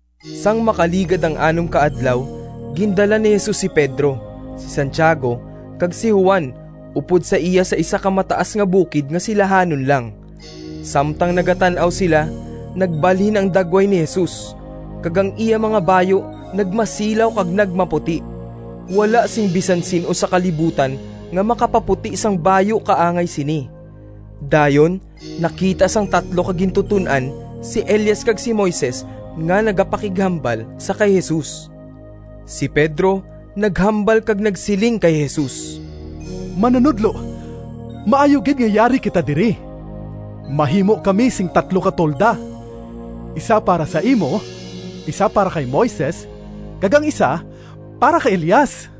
Sang makaligad ang anom ka adlaw, gindala ni Jesus si Pedro, si Santiago, kag si Juan upod sa iya sa isa ka mataas nga bukid nga silahanon lang. Samtang nagatan-aw sila, nagbalhin ang dagway ni Jesus, kag ang iya mga bayu nagmasilaw kag nagmaputi. Wala sing bisan sin-o sa kalibutan nga makapaputi sang bayu kaangay sini. Dayon nakita sang tatlo ka gintuton-an si Elias kag si Moises nga nagapakighambal sa kay Jesus. Si Pedro naghambal kag nagsiling kay Jesus, “Manunodlo, maayo gid nga yari kita diri. Mahimo kami sing tatlo ka tolda, isa para sa imo, isa para kay Moises, kag ang isa para kay Elias.”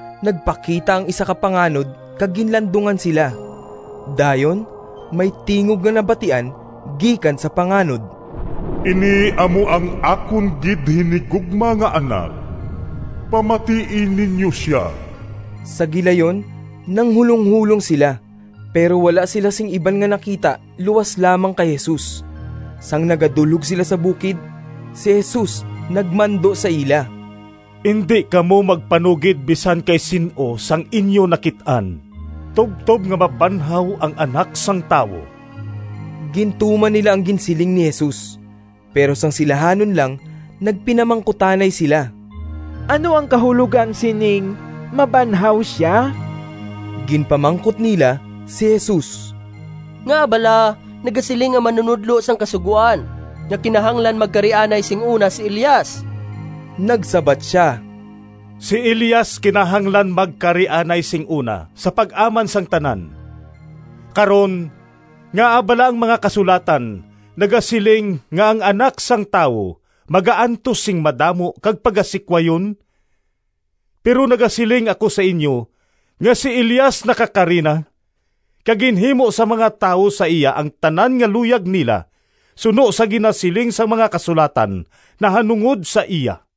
Nagpakita ang isa ka panganod kag ginlandungan sila. Dayon may tingog nga nabatian gikan sa panganod, “Ini amo ang akon gid hinigugma nga Anak. Pamatii ninyo sia!” Sa gilayon nanghulonghulong sila, pero wala sila sing iban nga nakita luas lamang kay Jesus. Sang nagadulhog sila sa bukid si Jesus nagmando sa ila, “Indi kamo magpanugid bisan kay sin-o sang inyo nakit-an, tubtob nga mabanhaw ang Anak sang Tawo.” Gintuman nila ang ginsiling ni Jesus, pero sang silahanon lang nagpinamangkutanay sila, “Ano ang kahulogan sining ‘mabanhaw sia’?” Ginpamangkot nila si Jesus, “Ngaa bala nagasiling ang mga manunodlo sang Kasugoan nga kinahanglan magkari anay sing una si Elias?” Nagsabat sia, “Si Elias kinahanglan magkari anay sing una sa pag-aman sang tanan. Karon ngaa bala ang mga Kasulatan nagasiling nga ang Anak sang Tawo magaantos sing madamo kag pagasikwayon? Pero nagasiling ako sa inyo nga si Elias nakakari na, kag ginhimo sang mga tawo sa iya ang tanan nga luyag nila, suno sa ginasiling sang mga Kasulatan nahanungod sa iya.”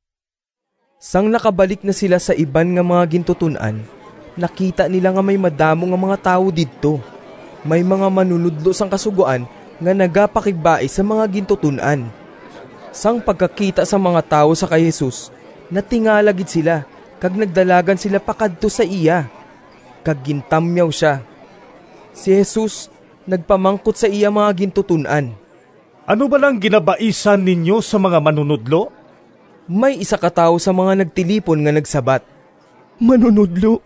Sang nakabalik na sila sa iban nga mga gintuton-an, nakita nila nga may madamo nga mga tawo didto. May mga manunodlo sang Kasugoan nga nagapakigbais sa mga gintuton-an. Sang pagkakita sang mga tawo sa kay Jesus, natingala gid sila kag nagdalagan sila pakadto sa iya, kag gintamyaw sia. Si Jesus nagpamangkot sa iya mga gintuton-an, “Ano bala ang ginabaisan ninyo sang mga manunodlo?” May isa ka tawo sa mga nagtilipon nga nagsabat, “Manunodlo,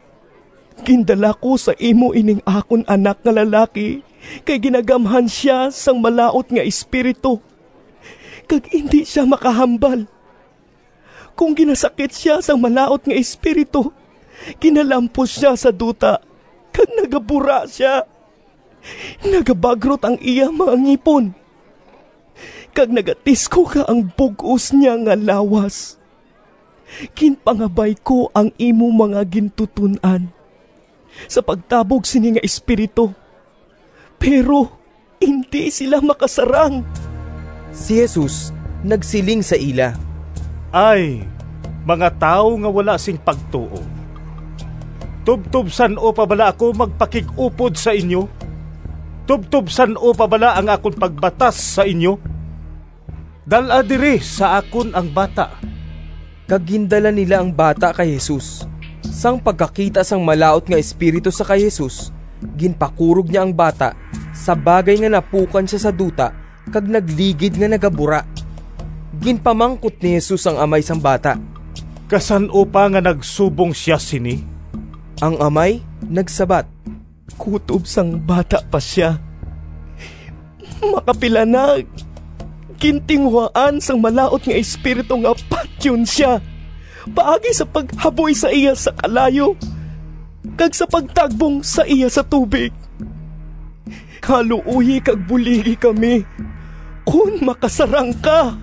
gindala ko sa imo ining akon anak nga lalaki kay ginagamhan sia sang malaut nga espiritu kag indi sia makahambal. Kon ginasakit sia sang malaut nga espiritu, ginalampos sia sa duta kag nagabura sia, nagabagrot ang iya mga ngipon, kag nagatiskog ang bug-os niya nga lawas. Ginpangabay ko ang imo mga gintuton-an sa pagtabog sini nga espiritu, pero indi sila makasarang.” Si Jesus nagsiling sa ila, “Ay, mga tawo nga wala sing pagtuo! Tubtob san-o pa bala ako magpakig-upod sa inyo? Tubtob san-o pa bala ang akon pagbatas sa inyo? Dal-a diri sa akon ang bata!” Kag gindala nila ang bata kay Jesus. Sang pagkakita sang malaut nga espiritu sa kay Jesus, ginpakurog niya ang bata sa bagay nga napukan sia sa duta kag nagligid nga nagabura. Ginpamangkot ni Jesus ang amay sang bata, “Kasan-o pa nga nagsubong sia sini?” Ang amay nagsabat, “Kutob sang bata pa sia. Makapila na gintinguhaan sang malaut nga espiritu nga patyon sia paagi sa paghaboy sa iya sa kalayo kag sa pagtagbong sa iya sa tubig. Kaluoyi kag buligi kami, kon makasarang ka!”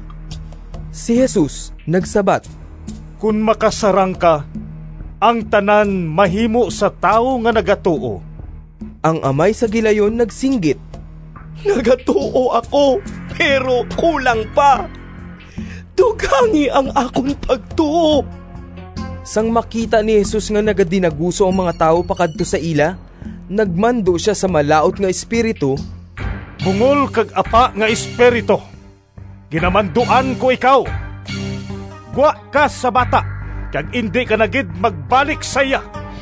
Si Jesus nagsabat, “Kon makasarang ka! Ang tanan mahimo sa tawo nga nagatuo.” Ang amay sa gilayon nagsinggit, “Nagatuo ako, pero kulang pa. Dugangi ang akon pagtuo!” Sang makita ni Jesus nga nagadinaguso ang mga tawo pakadto sa ila, nagmando sia sa malaut nga espiritu, “Bungol kag apa nga espiritu, ginamanduan ko ikaw, gwa ka sa bata kag indi ka na gid magbalik sa iya!”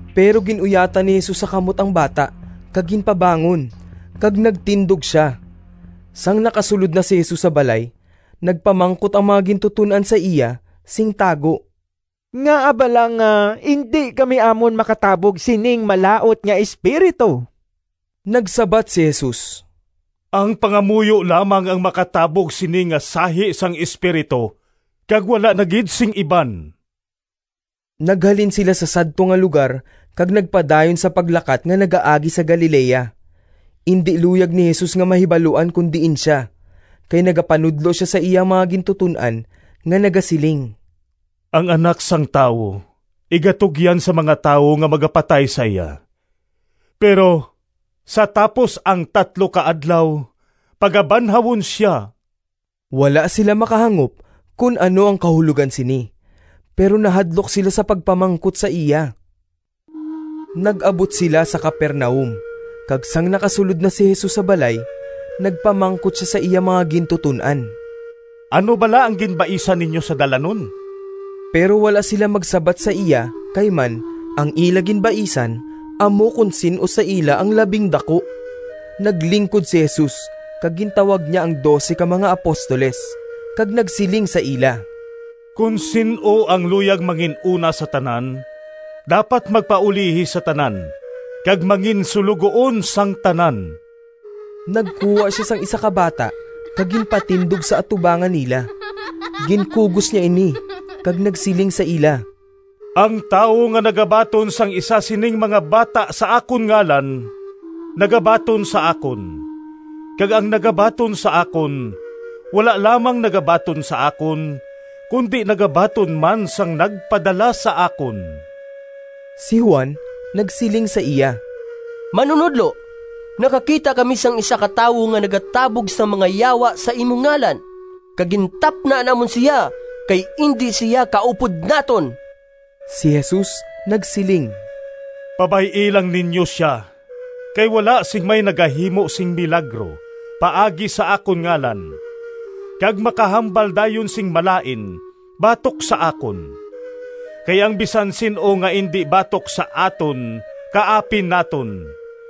Pero gin-uyatan ni Jesus sa kamot ang bata kag ginpabangon, kag nagtindog sia. Sang nakasulod na si Jesus sa balay, nagpamangkot ang mga gintuton-an sa iya sing tago, “Ngaa bala nga indi kami amon makatabog sining malaut nga espiritu?” Nagsabat si Jesus, “Ang pangamuyo lamang ang makatabog sini nga sahi sang espiritu kag wala na gid sing iban.” Naghalin sila sa sadto nga lugar kag nagpadayon sa paglakat nga nagaagi sa Galilea. Indi luyag ni Jesus nga mahibaluan kon diin sia, kay nagapanudlo sia sa iya mga gintuton-an nga nagasiling, “Ang Anak sang Tawo igatugyan sa mga tawo nga magapatay sa iya, pero sa tapos ang tatlo ka adlaw, pagabanhawon sia.” Wala sila makahangop kon ano ang kahulogan sini, pero nahadlok sila sa pagpamangkot sa iya. Nag-abot sila sa Capernaum, kag sang nakasulod na si Jesus sa balay, nagpamangkot sia sa iya mga gintuton-an, “Ano bala ang ginbaisan ninyo sa dalanon?” Pero wala sila magsabat sa iya kay man ang ila ginbaisan amo kon sin-o sa ila ang labing daku. Naglingkod si Jesus kag gintawag niya ang dose ka mga apostoles kag nagsiling sa ila, “Kon sin-o ang luyag mangin-una sa tanan, dapat magpaulihi sa tanan kag manginsuloguon sang tanan.” Nagkuha sia sing isa ka bata kag ginpatindog sa atubangan nila. Ginkugos niya ini kag nagsiling sa ila, “Ang tawo nga nagabaton sang isa sining mga bata sa akon ngalan, nagabaton sa akon, kag ang nagabaton sa akon, wala lamang nagabaton sa akon, kundi nagabaton man sang nagpadala sa akon.” Si Juan nagsiling sa iya, “Manunodlo, nakakita kami sang isa ka tawo nga nagatabog sang mga yawa sa imo ngalan, kag gintapna namon sia kay indi sia kaupod naton.” Si Jesus nagsiling, “Pabay-i lang ninyo sia kay wala sing may nagahimo sing milagro paagi sa akon ngalan kag makahambal dayon sing malain batok sa akon. Kay ang bisan sin-o nga indi batok sa aton kaapin naton.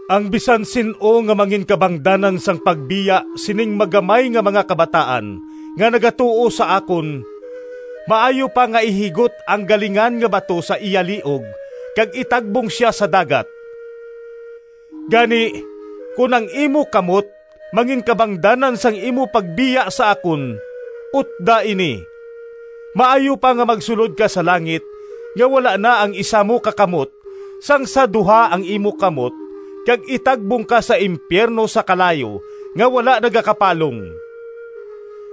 “Ang bisan sin-o nga manginkabangdanan sang pagbiya sining magamay nga mga kabataan nga nagatuo sa akon, maayo pa nga ihigot ang galingan nga bato sa iya liog kag itagbong sia sa dagat. Gani, kon ang imo kamot manginkabangdanan sang imo pagbiya sa akon, utda ini! Maayo pa nga magsulod ka sa langit nga wala na ang isa mo ka kamot sang sa duha ang imo kamot kag itagbong ka sa impiyerno sa kalayo nga wala nagakapalong. [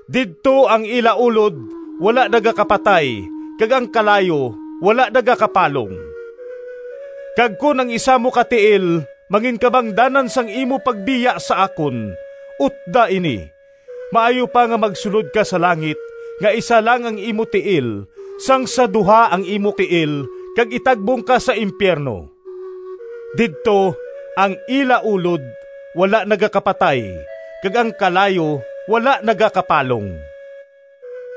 Didto ‘ang ila ulod wala nagakapatay kag ang kalayo wala nagakapalong.’] Kag kon ang isa mo ka tiil manginkabangdanan sang imo pagbiya sa akon, utda ini! Maayo pa nga magsulod ka sa langit nga isa lang ang imo tiil sang sa duha ang imo tiil kag itagbong ka sa impiyerno. [ Didto ‘ang ila ulod wala nagakapatay kag ang kalayo wala nagakapalong.’]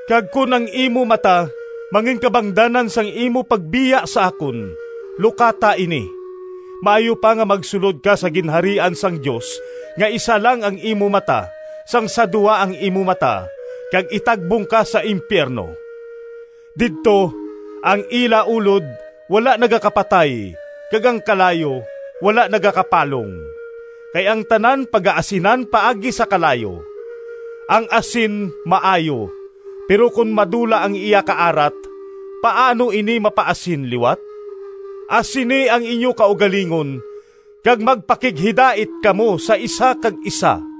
Kag kon ang imo mata manginkabangdanan sang imo pagbiya sa akon, lukata ini! Maayo pa nga magsulod ka sa Ginharian sang Dios nga isa lang ang imo mata sang sa duha ang imo mata kag itagbong ka sa impiyerno. Didto ‘ang ila ulod wala nagakapatay kag ang kalayo wala nagakapalong.’ “Kay ang tanan pagaasinan paagi sa kalayo. Ang asin maayo, pero kon madula ang iya kaarat paano ini mapaasin liwat? Asini ang inyo kaugalingon, kag magpakighidait kamo sa isa kag isa.”